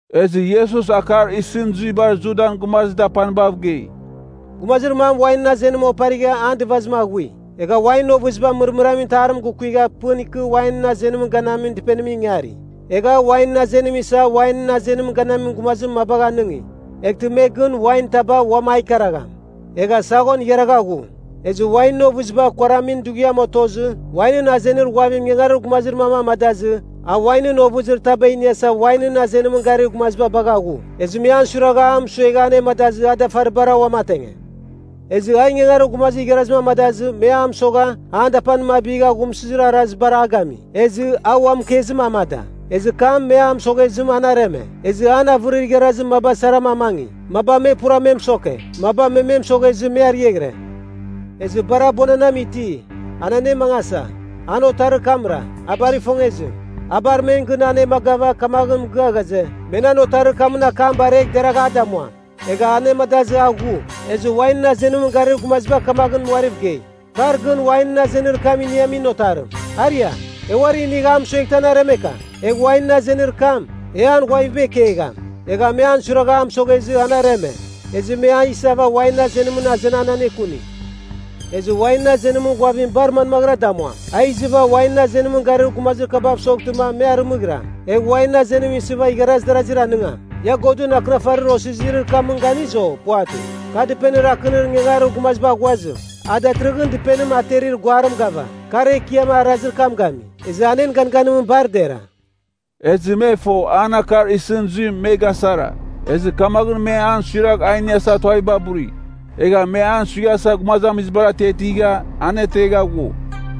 Ezɨ Iesus akar isɨn zuibar Judan gumazir dapanibav gei, “Gumazir mam wainɨn azenim oparigha an dɨvazim aghui. Egha wainɨn ovɨziba mɨrmɨramin itarim gukuigha pɨn ikɨ wainɨn azenimɨn ganamin dɨpenimɨn ingari. Egha a wainɨn azenim isa wainɨn azenimɨn ganamin gumazir mabagh anɨngi (eghtɨ me gɨn wain taba uam a ikaragham). Egha saghon igharagha ghu. Ezɨ wainɨn ovɨziba kuaramin dughiam otozɨ, wainɨn azenir ghuavim ingangarir gumazir mam amadazɨ a wainɨn ovɨzir taba iniasa wainɨn azenimɨn garir gumaziba bagha ghu. Ezɨ me an suiragha, a mɨsuegha anemadazɨ a dafaribara uamatenge. Ezɨ a ingangarir gumazir igharazim amadazɨ me a mɨsogha an dapanim abigha aghumsɨzir arazibar a gami. Ezɨ a ua mɨkezim amada, ezɨ kam me a mɨsoghezɨ an areme. Ezɨ an avɨrir igharazir maba saram amangi; maba me pura me mɨsoke, maba me me mɨsoghezɨ me ariaghɨre. “Ezɨ bar abuananam iti anenemangasa, an otarir kamra, a bar ifongezim. A bar men gɨn anemagava kamaghɨn mɨgɨa ghaze, ‘Me nan otarir kamɨn akam baregh deragh a damuam.’ Egha anemadazɨ a ghu. Ezɨ wainɨn azenimɨn garir gumaziba kamaghɨn uariv gei, ‘Kar gɨn wainɨn azenir kam iniamin otarim. Aria, e uari inigh a mɨsueghtɨ an aremeka. Egh wainɨn azenir kam, e an ghuaviba ikegham.’ Egha me an suiragha a mɨsoghezɨ an areme. Ezɨ me a isava wainɨn azenimɨn azenan anekuni. “Ezɨ wainɨn azenimɨn ghuavim bar manmaghɨra damuam? A izɨva wainɨn azenimɨn garir gumazir kabav soghtɨma me arɨmɨghiram. Egh wainɨn azenim isɨva igharaz darazir aningam. Ia Godɨn Akɨnafarir osizirir kamɨn ganiz, o puvatɨ? ‘Kar dɨpenir akɨnir ingangarir gumaziba aghuazim, a datɨrɨghɨn dɨpenim aterir guarim gava. Kar Ekiam arazir kam gami, ezɨ an en ganganimɨn bar dera.’” Ezɨ me fo an akar isɨn zuim me gasara, ezɨ kamaghɨn me an suiragh a iniasa tuaviba buri. Egha me an suighasa gumazamizibar atiatigha, anetegha ghue.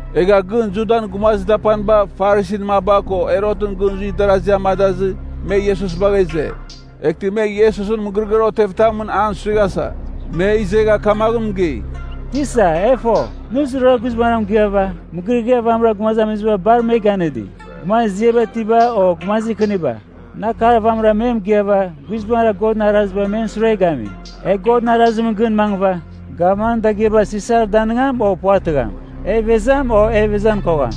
Egha gɨn Judan gumazir dapaniba Farisin maba ko Herotɨn gɨn zuir darasi amadazɨ, me Iesus bagha ize. Eghtɨ me Iesusɨn mɨgɨrɨgɨar otevitamɨn an suighasa. Me izegha kamaghɨn mɨgei, “Tisa, e fo, nɨ zurara guizbangɨra mɨgɨava, mɨgɨrɨgɨar vamɨra gumazamiziba bar me ganɨdi. Gumazir ziaba itiba o gumazir kɨniba, nɨ akar vamɨra me mɨgɨava guizbangɨra Godɨn arazibar men sure gami. E Godɨn arazim gɨn mangɨva, gavmanɨn dagɨaba Sisar danɨngam o puvatɨgham? E ivezam, o ivezan kogham?”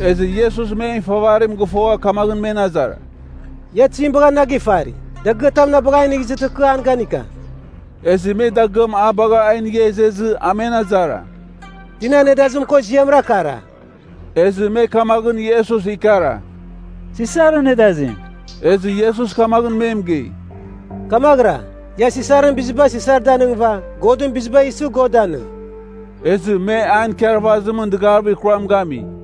Ezɨ Iesus men ifavarim gɨfogha kamaghɨn men azara, “Ia tizim bagha na gifari? Dagɨatam na bagh a inigh izɨtɨ kɨ an ganika.” Ezɨ me dagɨam a bagha a inigha izezɨ a men azara, “Tinan nedazim ko ziamra kara?” Ezɨ me kamaghɨn Iesus ikara, “Sisarɨn nedazim.” Ezɨ Iesus kamaghɨn me mɨgei, “Kamaghɨra, ia Sisarɨn biziba Sisar danɨngɨva, Godɨn biziba isɨ, God danɨng.” Ezɨ me an ikarvazimɨn dɨgavir kuram gami.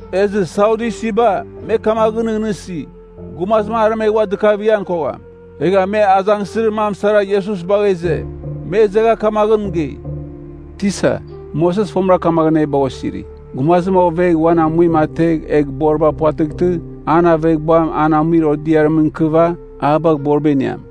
Ezɨ Sadyusiba, me kamaghɨn nɨghnɨsi, gumazim aremegh ua dɨkavighan kogham. Egha me azangsɨzir mam sara Iesus bagha ize. Me izegha kamaghɨn mɨgei, “Tisa, Moses fomɨra kamaghɨn e bagha osiri, gumazim ovegh uan amuim ategh egh boriba puvatɨghtɨ, an aveghbuam an amuir odiarimɨn ikɨva a bagh boriba iniam.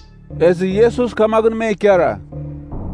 Ezɨ Iesus kamaghɨn me ikara,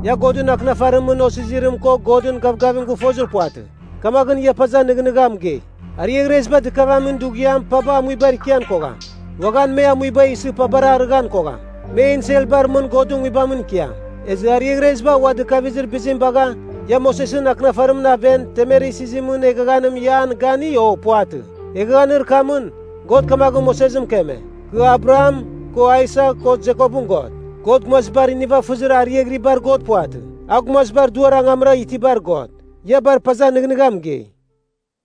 “Ia Godɨn Akɨnafarimɨn osizirim ko Godɨn gavgavim gɨfozir puvatɨ, kamaghɨn ia paza nɨghnɨgha mɨgei? Ariaghreziba dɨkavamin dughiam paba amuibar ikian kogham, uaghan me amuiba isɨ pabar arɨghan kogham. Me enselbar mɨn Godɨn Nguibamɨn ikiam. “Ezɨ ariaghreziba ua dɨkavizir bizim bagha, ia Mosesɨn Akɨnafarimɨn aven temer isizimɨn eghaghanim ia an gani, o puvatɨ? Eghaghanir kamɨn, God kamaghɨn Moses mɨkeme, ‘Kɨ Abraham, ko Aisak ko Jekopɨn God.’ God gumazibar nivafɨzir ariaghɨribar God puvatɨ, a gumazibar duar angamra itibar God. Ia bar paza nɨghnɨgha mɨgei.”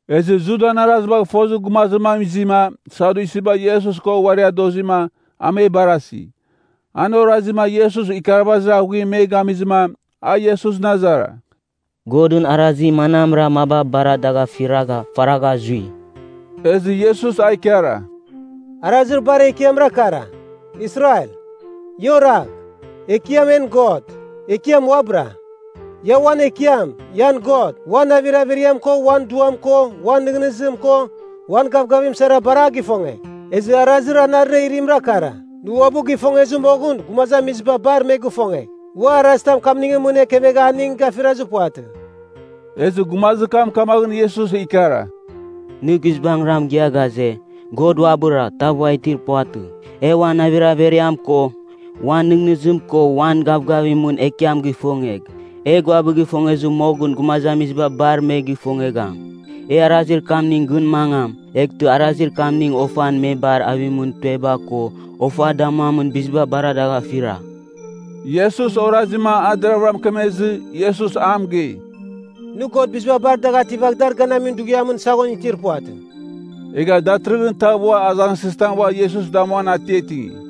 Ezɨ Judan arazibagh fozir gumazir mam izima Sadyusiba Iesus ko uari adozima, a me barasi. An orazima Iesus ikarvazir aghuim me ganɨngizɨma, a Iesusɨn azara, “Godɨn arazir manamra maba bar dagh afiragha, faragha zui?” Ezɨ Iesus a ikara, “Arazir bar ekiamra kara: ‘Israel, ia oragh. Ekiam en God, Ekiam uabɨra. Ia uan Ekiam, ian God, uan navir averiam ko uan duam ko uan nɨghnɨzim ko uan gavgavim sara bar a gifongegh.’ Ezɨ arazir anarɨra irimra kara, ‘Nɨ uabɨ gifongezir moghɨn gumazamiziba bar me gifongegh.’ Ua arazitam kamningɨn mɨn ekevegha aning gafirazir puvatɨ.” Ezɨ gumazir kam kamaghɨn Iesus ikara, “Nɨ guizbangɨra mɨgɨa ghaze, God uabɨra, tav ua itir puvatɨ. E uan navir averiam ko, uan nɨghnɨzim ko uan gavgavimɨn Ekiam gifongegh, egh uabɨ gifongezir moghɨn gumazamiziba bar me gifongegham. E arazir kamningɨn gɨn mangam, eghtɨ arazir kamning ofan me bar avimɨn tueba ko ofa damuamin biziba bar dagh afira.” Iesus orazima a deravɨra mɨkemezɨ, Iesus a mɨgei, “Nɨ God biziba bar dagh ativagh dar ganamin dughiamɨn saghon itir puvatɨ.” Egha datɨrɨghɨn tav ua azangsɨzitam ua Iesus damuan atiatingi.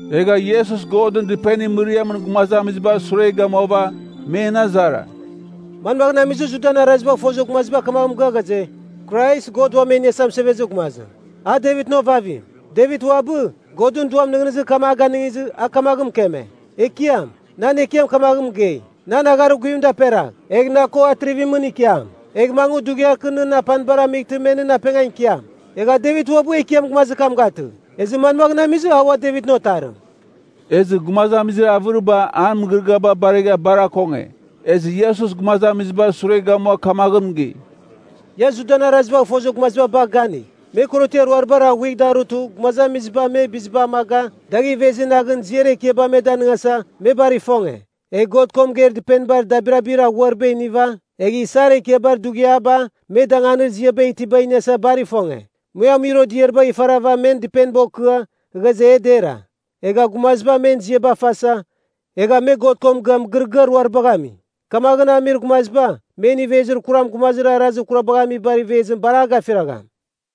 Egha Iesus Godɨn Dɨpenir mɨriamɨn gumazamizibar sure gamuava, men azara, “Manmagh amizɨ Judan arazibagh fozir gumaziba kamaghɨn mɨgɨa ghaze, Krais, God Uam E Iniasa Mɨsevezir Gumazim, a Devitɨn ovavim? Devit uabɨ, Godɨn Duam nɨghnɨzir kam a ganɨngizɨ, a kamaghɨn mɨkeme, ‘Ekiam, nan Ekiam kamaghɨn a mɨgei, “Nan agharir guvim daperagh, egh na ko atrivimɨn ikiam. Egh mangɨ dughiar kɨ nɨn apanibar amightɨ me nɨn apengan ikiam.” ’ Egha Devit uabɨ ‘Ekiam’ gumazir kam gatɨ. Ezɨ manmaghɨn amizɨ a ua Devitɨn Otarim?” Ezɨ gumazamizir avɨriba an mɨgɨrɨgɨaba baregha bar akonge. Ezɨ Iesus gumazamizibar sure gamua kamaghɨn mɨgei, “Ia Judan arazibagh fozir gumaziba bagh ganigh. Me korotiar ruaribar aghuigh darutɨ gumazamiziba me biziba amaga dagh ivezi naghɨn ziar ekiaba me danɨngasa, me bar ifonge. Egh God ko mɨgeir dɨpenibar dabirabir aghuariba iniva, egh isar ekiabar dughiaba me danganir ziaba itiba iniasa bar ifonge. Me amuir odiaribagh ifarava men dɨpeniba okɨa, ghaze e dera. Egha gumaziba men ziaba fasa, egha me God ko mɨgɨa mɨgɨrɨgɨar ruaribagh ami. Kamaghɨn amir gumaziba, men ivezir kuram gumazir arazir kurabagh amibar ivezim bar a gafiragham.”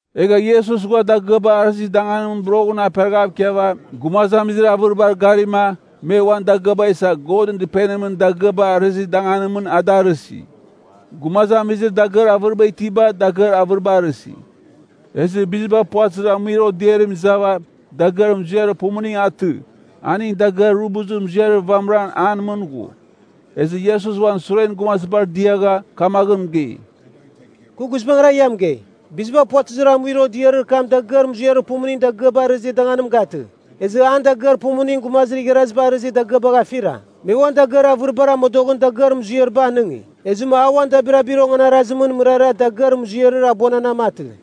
Egha Iesus ghua dagɨaba arɨzir danganimɨn boroghɨn aperaghav ikiava gumazamizir avɨribar garima me uan dagɨaba isa Godɨn Dɨpenimɨn dagɨaba arɨzir danganimɨn a da arɨsi. Gumazamizir dagɨar avɨriba itiba dagɨar avɨriba arɨsi. Ezɨ biziba puvatɨzir amuir odiarim izava dagɨar muziarir pumuning atɨ, aning dagɨar rubuzir muziarir vamɨra an mɨn ghu. Ezɨ Iesus uan suren gumazibar diagha kamaghɨn mɨgei, “Kɨ guizbangɨra ia mɨgei, biziba puvatɨzir amuir odiarir kam dagɨar muziarir pumuning dagɨaba arɨzir danganim gatɨ, ezɨ an dagɨar pumuning gumazir igharaziba arɨghɨzir dagɨabagh afira. Me uan dagɨar avɨribar amodoghɨn dagɨar muziariba anɨngi. Ezɨma a uan dabirabir onganarazimɨn mɨrara dagɨar muziarir abuananam atɨ.”